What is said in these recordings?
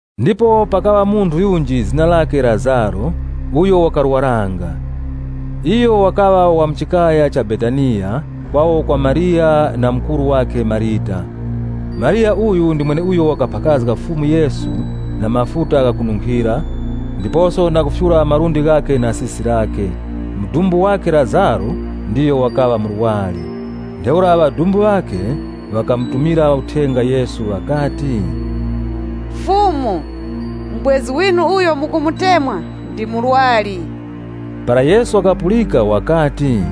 Ndipo pakaŵa munthu yunji zina lakhe Lazaro uyo wakarwaranga. Iyo wakaŵa wa mu chikaya cha Betaniya kwawo kwa Mariya na mukuru wakhe Marita. Mariya uyu ndi mweneuyo wakaphakazga Fumu Yesu na mafuta ghakununkhira ndiposo na kufyura malundi ghakhe na sisi lakhe. Mudumbu wakhe Lazaro ndiyo wakaŵa murwari. Ntheura ŵadumbu ŵakhe ŵakamutumira uthenga Yesu ŵakati, “Fumu, mubwezi winu uyo mukumutemwa ndi murwari.” Para Yesu wakapulika wakati,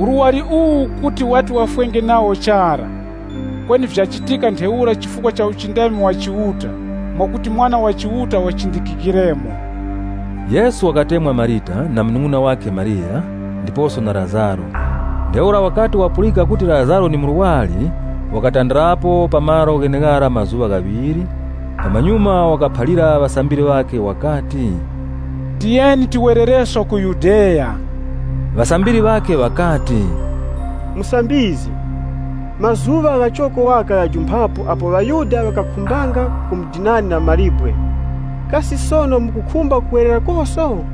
“Urwari uwu kuti wati wafwenge nawo chara, kweni vyachitika ntheura chifukwa cha uchindami wa Chiuta mwakuti Mwana wa Chiuta wachindikikiremo.” Yesu wakatemwa Marita, na munung'una wakhe Mariya, ndiposo na Lazaro. Ntheura wakati wapulika kuti Lazaro ndi murwari, wakatandarapo pa malo gheneghara mazuŵa ghaŵiri. Pamanyuma wakaphalira ŵasambiri ŵakhe wakati, “Tiyeni tiwerereso ku Yudeya.” Ŵasambiri ŵakhe ŵakati, “Musambizgi, mazuŵa ghachoko waka ghajumphapo apo ŵaYuda ŵakakhumbanga kumudinani na mawe, kasi sono mukukhumba kuwererakoso?”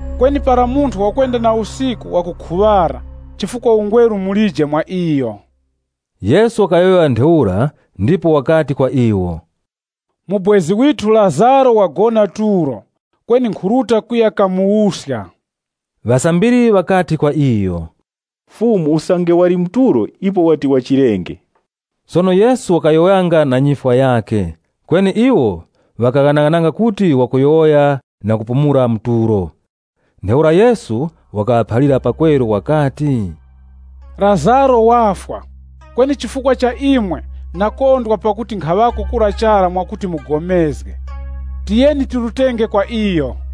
Kweni para munthu wakwenda na usiku wakukhuŵara chifukwa ungweru mulije mwa iyo.” Yesu wakayowoya ntheura ndipo wakati kwa iwo, “Mubwezi withu Lazaro wagona tulo, kweni nkhuruta kuya kamuwuska.” Ŵasambiri ŵakati kwa iyo, “Fumu, usange wali mu tulo ipo wati wachirenge.” Sono Yesu wakayowoyanga na nyifwa yakhe. Kweni iwo ŵakaghanaghananga kuti wakuyowoya na kupumula mu tulo. Ntheura Yesu wakaŵaphalira pakweru wakati, “Lazaro wafwa. Kweni chifukwa cha imwe, ndakondwa pakuti nkhaŵako kura chara mwakuti mupulikane. Tiyeni tirutenge kwa iyo.”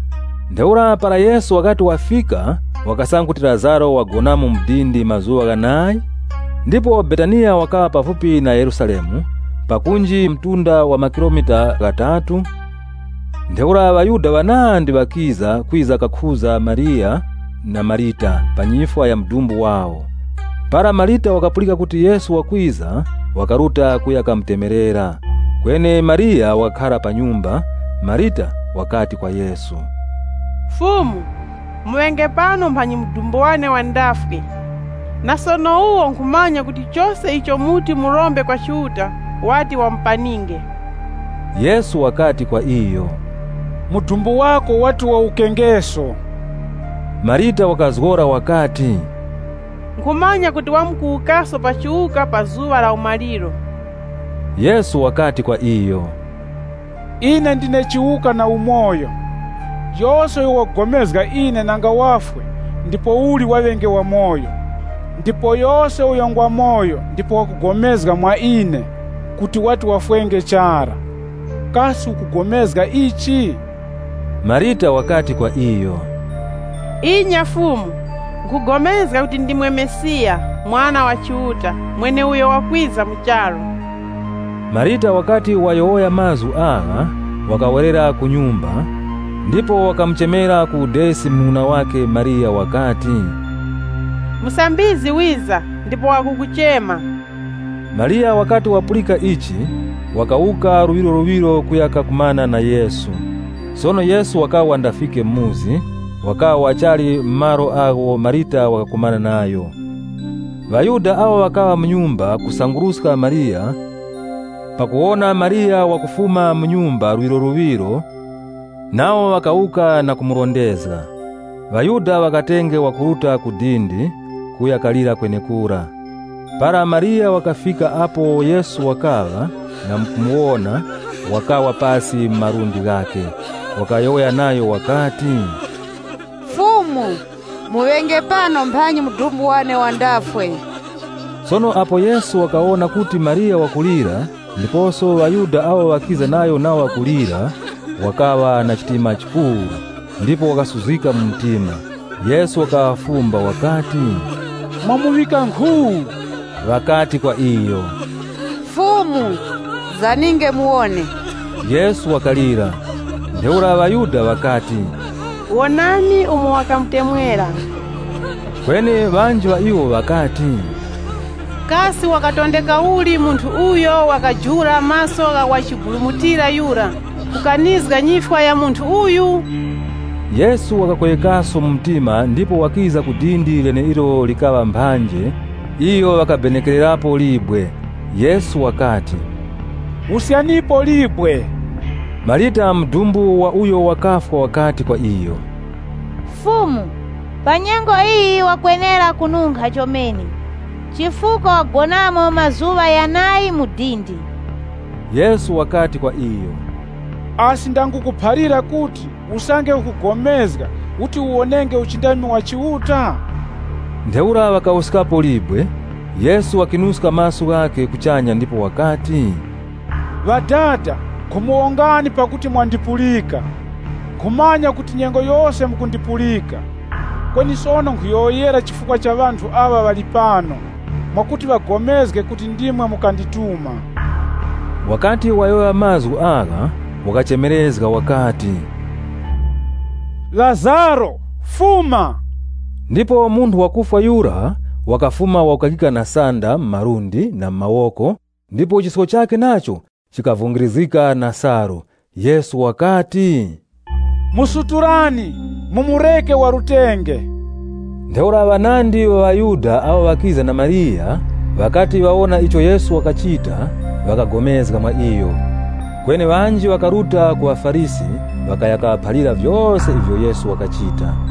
Ntheura para Yesu wakati wafika wakasanga kuti Lazaro wagonamo mu dindi mazuŵa ghanayi. Ndipo Betaniya wakaŵa pafupi na Yerusalemu, pakunji mtunda wa makilomita ghatatu. Ntheura ŵaYuda ŵanandi ŵakiza kwiza kakhuza Mariya na Marita pa nyifwa ya mudumbu wawo. Para Marita wakapulika kuti Yesu wakwiza, wakaruta kuya kamutemerera, kweni Mariya wakakhara pa nyumba. Marita wakati kwa Yesu, “Fumu, muŵenge pano mphanyi mudumbu wane wandafwe! Na sono wuwo nkhumanya kuti, chose icho muti murombe kwa Chiuta, wati wamupaninge.” Yesu wakati kwa iyo, “Mudumbu wako wati wawukengeso.” Marita wakazgora wakati, “Nkhumanya kuti wamkuwukaso pa chiwuka pa zuŵa la umaliro.” Yesu wakati kwa iyo, “Ine ndine chiwuka na umoyo. Yose uyo wakupulikana na ine, nanga wafwe, ndipouli waŵenge wamoyo. Ndipo yose uyo ngwamoyo ndipo wakupulikana na ine, kuti wati wafwenge chara. Kasi ukupulikana na ichi?” Marita wakati kwa iyo, “Inya Fumu. Nkhupulikana kuti ndimwe Mesiya, Mwana wa Chiuta, mweneuyo wakatenge wakwiza muno mu charu.” Marita wakati wayowoya mazgu agha, wakawerera ku nyumba, ndipo wakamuchemera ku udesi munung'una wakhe Mariya wakati, “Musambizgi wiza, ndipo wakukuchema.” Mariya wakati wapulika ichi, wakawuka luŵiroluŵiro kuya kakumana na Yesu. Sono Yesu wakaŵa wandafike mu chikaya, wakaŵa wachali mu malo agho Marita wakakumana nayo. ŴaYuda awo ŵakaŵa mu nyumba kusanguruska Mariya, pakuwona Mariya wakufuma mu nyumba luŵiroluŵiro, nawo ŵakawuka na kumurondezga. ŴaYuda ŵakatenge wakuruta ku dindi kuya kalira kwenekura. Para Mariya wakafika apo Yesu wakaŵa na kumuwona, wakawa pasi pa malundi ghakhe, wakayowoya nayo wakati, “Fumu, muŵenge pano mphanyi mudumbu wane wandafwe.” Sono apo Yesu wakawona kuti Mariya wakulira ndiposo ŵaYuda awo ŵakiza nayo nawo ŵakulira, wakaŵa na chitima chikuru ndipo wakasuzgika mu mtima. Yesu wakaŵafumba wakati, “Mwamuŵika nkhu?” Ŵakati kwa iyo, “Fumu, zaninge muwone.” Yesu wakalira. Ntheura ŵaYuda ŵakati, “Wonani umo wakamutemwera!” Kweni ŵanji ŵa iwo ŵakati, “Kasi wakatondeka uli munthu uyo wakajula maso gha wachiburumutira yura, kukanizga nyifwa ya munthu uyu?” Yesu wakakweŵekaso mu mtima ndipo wakiza ku dindi leneilo likaŵa mphanji iyo ŵakabenekererapo libwe. Yesu wakati, “Wuskanipo libwe.” Marita mudumbu wa uyo wakafwa wakati kwa iyo, “Fumu, pa nyengo iyi wakwenera kununkha chomene, chifukwa wagonamo mazuŵa ghanayi mu dindi.” Yesu wakati kwa iyo, “Asi ndangukuphalira kuti, usange ukupulikana uti uwonenge uchindami wa Chiuta?” Ntheura ŵakawuskapo libwe. Yesu wakinuska maso ghakhe kuchanya ndipo wakati, “Ŵadada, nkhumuwongani pakuti mwandipulika. Nkhumanya kuti nyengo yose mukundipulika, kweni sono nkhuyowoyera chifukwa cha ŵanthu aŵa ŵali pano, mwakuti ŵapulikane kuti ndimwe mukandituma.” Wakati wayowoya mazgu agha wakachemerezga wakati, “Lazaro, fuma!” Ndipo munthu wakufwa yura wakafuma wakukakika na sanda mu malundi na mu mawoko, ndipo chisko chakhe nacho chikavungirizgika na salu. Yesu wakati kwa iwo, “Musutulani mumureke warutenge.” Ntheura ŵanandi ŵaYuda awo ŵakiza na Mariya ŵakati ŵawona icho Yesu wakachita, ŵakapulikana mwa iyo. Kweni ŵanji ŵakaruta ku ŵaFarisi ŵakaya kaŵaphalira vyose ivyo Yesu wakachita.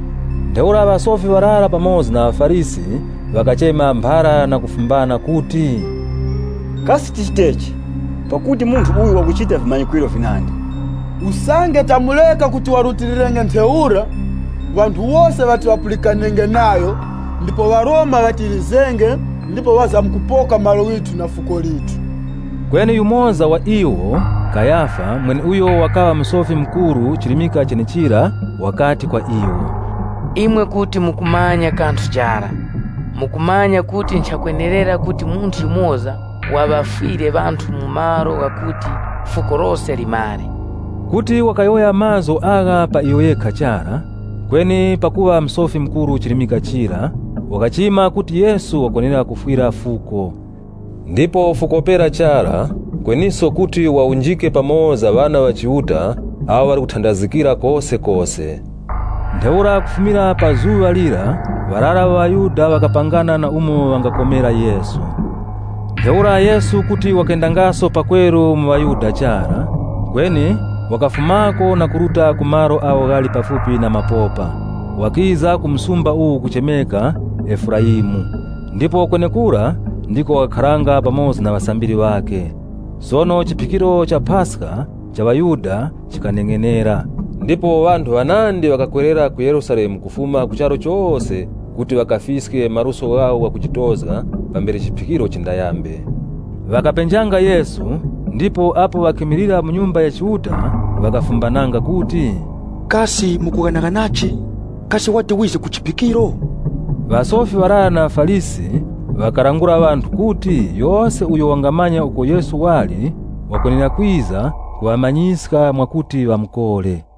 Ntheura ŵasofi ŵarara pamoza na ŴaFarisi ŵakachema mphara na kufumbana kuti, “Kasi tichitechi? Pakuti munthu uyu wakuchita vimanyikwiro vinandi. Usange tamureka kuti warutilirenge ntheura, ŵanthu wose ŵati ŵapulikanenge nayo, ndipo ŵaRoma ŵati ŵizenge ndipo ŵazamkupoka malo ghithu ghakupatulika na fuko lithu.” Kweni yumoza wa iwo, Kayafa, mweneuyo wakaŵa Musofi Mukuru chirimika chenechira, wakati kwa iwo, “Imwe kuti mukumanya kanthu chara! Mukumanya kuti nchakwenerera kuti munthu yumoza waŵafwire ŵanthu mu malo ghakuti fuko lose limare?” Kuti wakayowoya mazgu agha pa iyo yekha chara, kweni pakuŵa Musofi Mukuru chirimika chira, wakachima kuti Yesu wakwenera kufwira fuko. Ndipo fuko pera chara, kweniso kuti wawunjike pamoza ŵana ŵa Chiuta awo ŵali kumbinikira kosekose. Ntheura kufumira pa zuŵa lira ŵarara ŵa ŵaYuda ŵakapangana na umo ŵangakomera Yesu. Ntheura Yesu kuti wakendangaso pakweru mu ŵaYuda chara. Kweni wakafumako na kuruta ku malo agho ghali pafupi na mapopa, wakiza ku muzi uwu ukuchemeka Efurayimu, ndipo kwenekura ndiko wakakharanga pamoza na ŵasambiri ŵakhe. Sono chiphikiro cha Paska cha ŵaYuda chikaneng'enera. Ndipo ŵanthu ŵanandi ŵakakwerera ku Yerusalemu kufuma ku charu chose kuti ŵakafiske maluso ghawo ghakujitozga pambere chiphikiro chindayambe. Ŵakapenjanga Yesu, ndipo apo ŵakimilira mu Nyumba ya Chiuta ŵakafumbananga kuti, “Kasi mukughanaghanachi? Kasi wati wize ku chiphikiro?” Ŵasofi ŵarara na ŴaFarisi ŵakalangula ŵanthu kuti yose uyo wangamanya uko Yesu wali wakwenera kwiza kaŵamanyiska mwakuti ŵamukore.